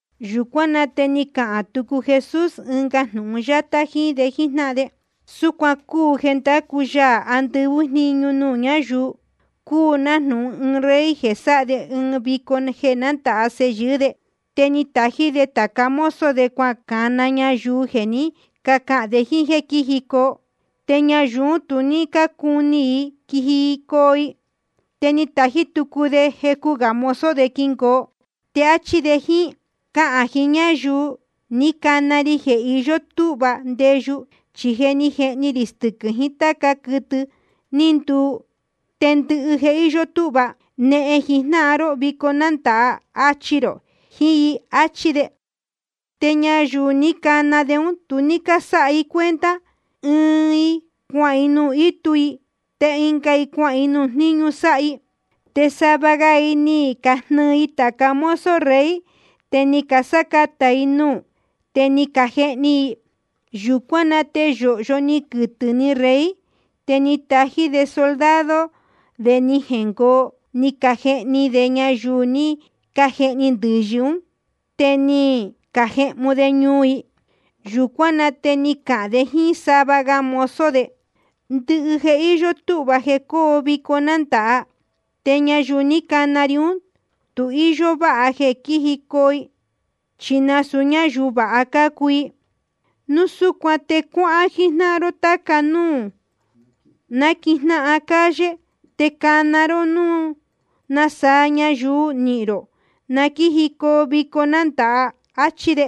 Yūcuán na te ni cahān tucu Jesús ɨnga jnūhun yátá jíín de jíjnáhan de: Súcuan cúu jeē ndácu Yaā andɨvɨ́ jniñu nuū ñáyuu: Cúu nájnūhun ɨɨn rey jeē sáha de ɨɨn vico jeē nándāha sēhe yɨɨ́ de. Te ni tají de tāca mozo de cuacana ñayuu jeē ni cáhān de jíín jéē quíjicoo. Te ñayuu ún tu ní cácuni i quijicoo i. Te ni tají tucu de jecu gā mozo quingoo, te áchí de jíín: Cahān jiín ñáyuu ní cana ri un jéē iyó túhva ndeyu. Chi je ni jehni rī stɨquɨ̄ rī jiín táca gá quɨtɨ ní nduu, te ndɨhɨ je íyó túhva. Nehen jijnáhan ró vico nándāha. Achi rō jiín i. Achí de. Te ñayuu ní cana de ún tu ní cásáha i cuenta. Chi ɨɨn i cuahān nuū ítu i, te ɨnga i cuahān nuū jníñu sáha i. Te sava ga i ni cajnɨɨ i tāca mozo rey, te ni casácatā i nuū, te ni cajehni i. Yūcuán na te yōhyo ni quɨtɨ̄ ni rey. Te ni tají de soldado de ni jengoo, ni cajehni de ñayuu ní cajehni ndɨ̄yɨ ún, te ni cajehmu de ñuu i. Yūcuán na te ni cahān de jíín sava ga mozo de: Ndɨhɨ je íyó túhva jeē cóo vico nándāha. Te ñayuu ní cana ri ún, tu íyó váha jeē quíjicoo i chi nasūu ñáyuu vāha cácuu i. Núu súcuan te cuáhán jijnáhan ró táca núū náquijnáhan calle. Te cana ró núu nasaa ñayuu nihīn rō, na quíjicoo i vico nándāha. Achí de.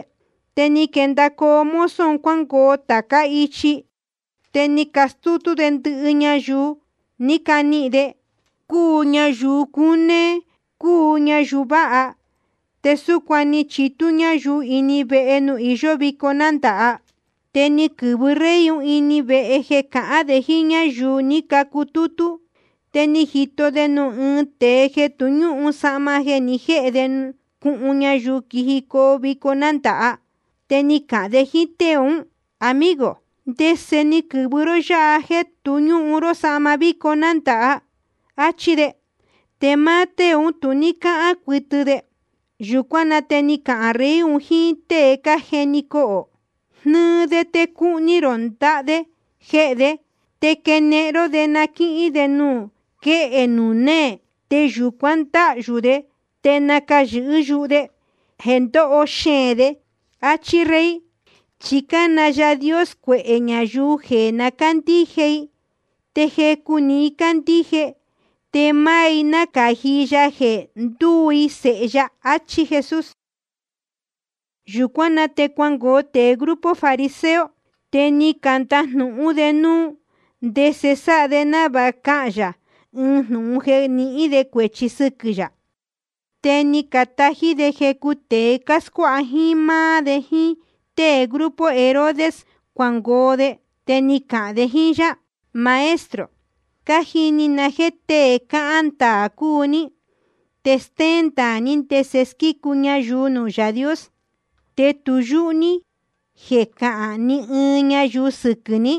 Te ni quendacoo mozo un cuángoo tācá ichi. Te ni castútú de ndɨhɨ ñayuu ní canihīn de, cúu ñayuu cunéé, cúu ñayuu váha. Te súcuan te ni chitú ñáyuu ini vehe nuū iyó vico nándāha. ’Te ni quɨ̄vɨ rey ini vehe jeē cahán de jíín ñáyuu ni cutútú. Te ni jito de nuū ɨɨn tēe jeē tu ñúhun sahma jeē ni jéhe de cuhun ñayuu quijicoo vico nándāha. Te ni cahān de jíín tée ún: Amigo, ¿ndese ni quɨ̄vɨ ró yáha jéē tu ñúhun ró sahma vico nándāha? áchí de. Te máá tée ún tu ní cáhán cuɨtɨ de. Yūcuán na te ni cahān rey jiín tée cájeni cohō: Jnɨɨ de te cuhni rō ndaha de jehē de, te quenehen ró de na quíhín de nuū quéhe nuū néē. Te yūcuan ndáhyū de te nacayɨ̄hɨ́ yuhu de jeē ndóho xeēn de. Achí rey. Chi cána Yaā Dios cuehē ñayuu jeē na cándíje i. Te jecu‑ni i candíje, te máá i nácāji ya jeē ndúu i sēhe ya. Achí Jesús. Yūcuán na te cuangoo tēe grupo fariseo. Te ni candajnūhún de núu ndese sáha de návāha cahān yā ɨɨn jnūhun jeē nihín de cuēchi sɨquɨ̄ yā. Te ni catají de jecu tēe cáscuáha jíín máá de jíín tée grupo Herodes cuangoo de. Te ni cacahān de jíín yá: Maestro, cájini na jéē tée cáhán ndaā cúu ní, te stéén ndaā ní ndese squícu ñayuu nuū Yaā Dios. Te tu yúhú ní jeē cahán ni ɨɨn ñayuu sɨquɨ̄ ní,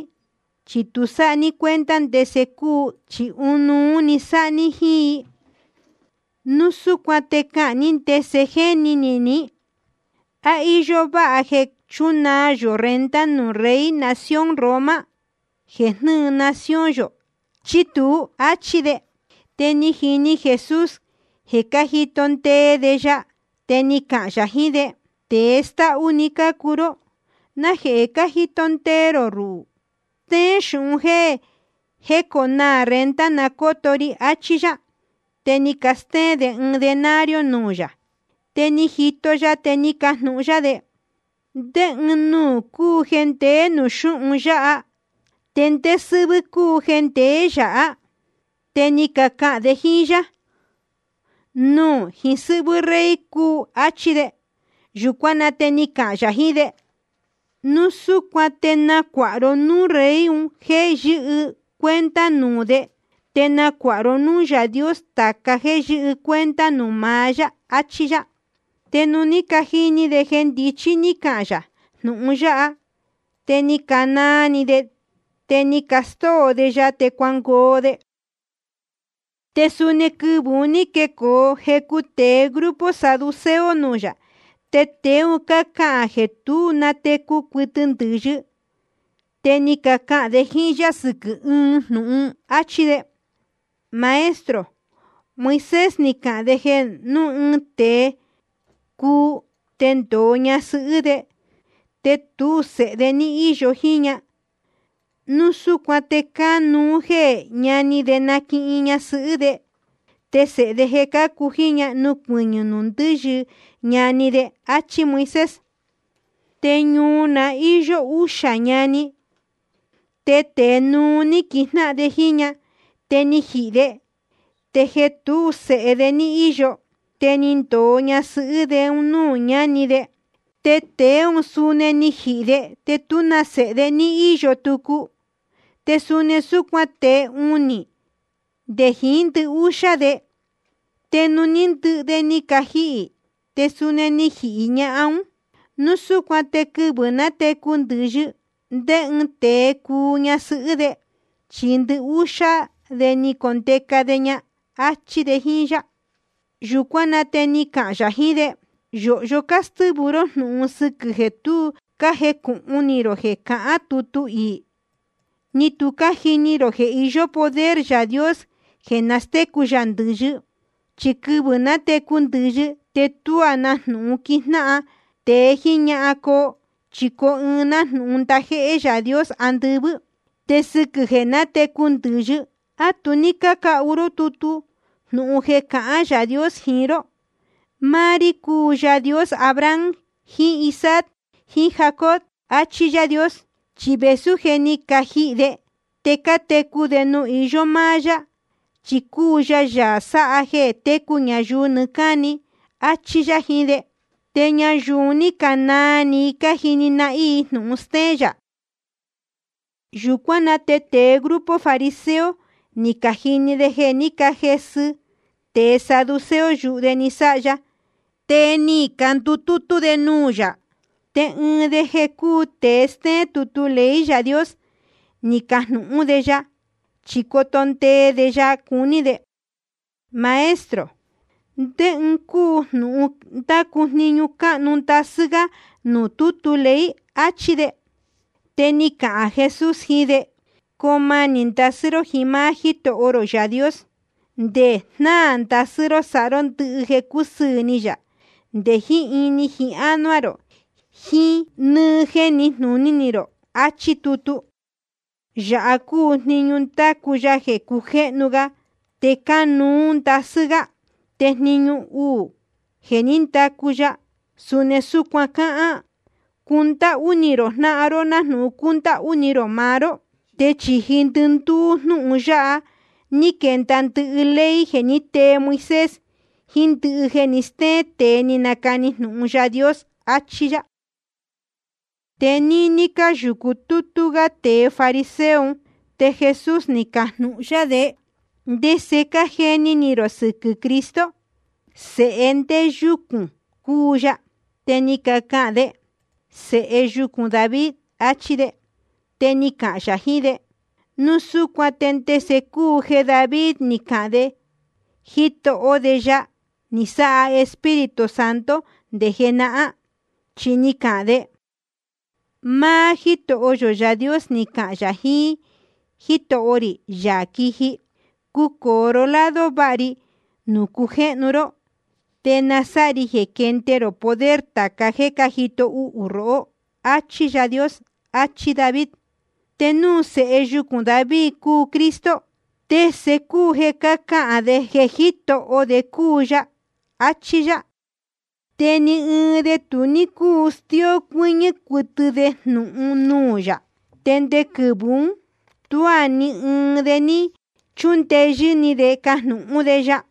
chi tu sáha ní cuenta ndese cúu ɨɨn ɨɨn i, chi ɨnuú‑ni sáha ní jíín i. Núu súcuan te cahān ní ndese jéni ni ní: ¿A íyó váha jeē chúnaa yō renta nuū rey nación Roma jeē jnɨ́ɨ nación yō, chí tuú? áchí de. Te ni jini Jesús jeē cájito ndee de ya. Te ni cahān yā jiín de: Tēe stáhú‑ni cácuu ró. ¿Najehē cájito ndee rō ruhū? Stéén xūhun jéē jéconaā renta na cóto ri, achí yá. Te ni castéén de ɨɨn denario nuū yā. Te ni jito ya, te ni cajnūhun yá de: ¿Ndé ɨɨn nuū cúu jeē ndeé nuū xúhun yáha, te ndé sɨ́hvɨ́ cúu jeē ndeé yāhá? Te ni cacahān de jíín yá: Nuū jiín sɨ́hvɨ́ rey un cúu, áchí de. Yūcuán na te ni cahān yā jiín de: Núu súcuan te nacuāha ró núū rey un jéē yɨ́hɨ cuenta nuū de, te nacuāha ró núū Yaā Dios tāca jéē yɨ́hɨ cuenta nuū maá yá, achí yá. Te nuū ní cajini de jeē ndichí ní cahān yā jnūhun yáha, te ni canaa ni de, te ni castóo de ya, te cuangoo de. Te suni quɨvɨ̄ un ní quecoo jecu tēe grupo saduceo nuū yā. Te tēe un cácahān jeē tu nátecu cuɨtɨ ndɨ̄yɨ. Te ni cacahān de jíín yá sɨquɨ̄ ɨɨn jnūhun, áchí de: Maestro, Moisés ni cahān de jeē núu ɨɨn tēe cuu de, te ndōo ñasɨhɨ́ de, te núu tú sēhe de ní íyo jíín ña, núu súcuan te cánuú jeē ñani de naquihin ñasɨhɨ́ de, te sēhe de jeē cácu jíín ña nucuɨñɨ̄ nuū ndɨ́yɨ ñani de. Achí Moisés. Te ñuu na ní īyo uxā ñani. Te tēe núú ní quijnáhan de jíín ñahan. Te ni jihī de. Te jeē tú sēhe de ní íyo, te ni ndōo ñasɨhɨ́ de nuū ñáni de. Te tēe ún suni ni jihī de, te tú na sēhe de ní íyo tucu. Te suni súcuan tēe unī, nde jiín ndɨhúxá de. Te nuū ní ndɨhɨ de ni cajihī, te suni ni jihī ñahan ún. Núu súcuan te quɨvɨ̄ nátecu ndɨ̄yɨ, ¿ndé ɨɨn de cuu ña ñasɨhɨ́ de? Chi ndɨhúxá de ni condeca de ña. Achí de jíín yá. Yūcuán na te ni cahān yā jiín de: Yōhyo cástɨ́vɨ ró jnūhun sɨquɨ̄ jeē tu cájecūhun ni rō jeē cahán tutu iī, ni tu cájini rō jeē iyó poder Yaā Dios jeē nastécu yā ndɨ̄yɨ. Chi quɨvɨ̄ nátecu ndɨ̄yɨ, te tuá na jnūhun quijnáhan tēe jíín ñahan coo. Chi coo i nájnūhun ndajéhé Yaā Dios andɨvɨ́. Te sɨquɨ̄ jeē nátecu ndɨ̄yɨ, ¿á tu ní cácahu ró tutu jnūhun jeē cahán Yaā Dios jiín ró? Máá rí cúu Yaā Dios Abraham jiín Isaac jiín Jacob, achí Yaā Dios. Chi vēsú je ni cajihī de, te cátecu de nuū iyó máá yá, chi cúu ya Yaā sáha jeē técu ñayuu nɨɨ́ cáni. Achí yá jiín de. Te ñayuu un ní canaa ni i cájini nahín i jnūhun stéén yā. Yūcuán na te tēe grupo fariseo ni cajini de jeē ní cajesɨ tēe saduceo yuhu de ni sáha ya. Te ni candutútú de nuū yā. Te ɨɨn de jeē cúu tēe stéén tutu ley Yaā Dios, ni cajnūhún de ya, chi coto ndee de ya cuní de: Maestro, ¿ndé ɨɨn cúu jnūhun ndácu jniñu cánuú ndasɨ́ gá nuū tútu ley? achí de. Te ni cahān Jesús jiín de: Coo manī ndasɨ́ ró jiín máá Jítoho rō Yaā Dios, nde jnáā ndasɨ́ ró sáha ró ndɨhɨ jeē cúsɨɨ̄ ni yā, nde jiín ini jiín ánuá rō, jiín nɨ́ɨ́ jéē níjnūní rō, achí tutu. Yāha cúu jniñu ndácu ya jeē cujéhnu ga te cánuú ndasɨ́ gá. Te jniñu uū jeē ní ndacu ya, suni súcuan cáhán: Cundáhú ni rō jnáhan ró nájnūhun cúndáhú ni rō maá ró. Te chīji ndɨndúú jnúhun yáha ní quenda ndɨhɨ ley jeē ní tee Moisés, jiín ndɨhɨ jeē ní castéén tēe ni canacani jnūhun Yaā Dios, achí yá. Te níní cáyūcu tútú gá tēe fariseo un, te Jesús ni cajnūhun yá de: ¿Ndese cájeni ni rō sɨquɨ̄ Cristo? ¿Sēhe ndé yúcūn cúu ya? Te ni cacahān de: Sēhe yucūn David, achí de. Te ni cahān yā jiín de: Núu súcuan ¿te ndese cúu jeē David ni cahān de Jitoho de ya, ni sáha Espíritu Santo nde jenahán? Chi ni cahān de: Máá Jítoho yō Yaā Dios ni cahān yā jiín Jítoho rī, Yaā quiji: Cucōo ró lado váha ri nuū cujéhnu ró, te na sáha ri jeē quende rō poder tāca jéē cájito uhū rohó. Achí Yaā Dios. Achí David. Te núu sēhe yucūn David cúu Cristo, ¿te ndese cúu jeē ni cáhān de jeē Jítoho de cúu ya? áchí yá. Te ni ɨɨn de tu ní cúu stió cuɨ́ñɨ́ cuɨtɨ de jnūhun nuū yā. Te nde quɨvɨ̄ ún tuá ni ɨɨn de ní chúndeyɨ́ ni de cajnūhún de ya.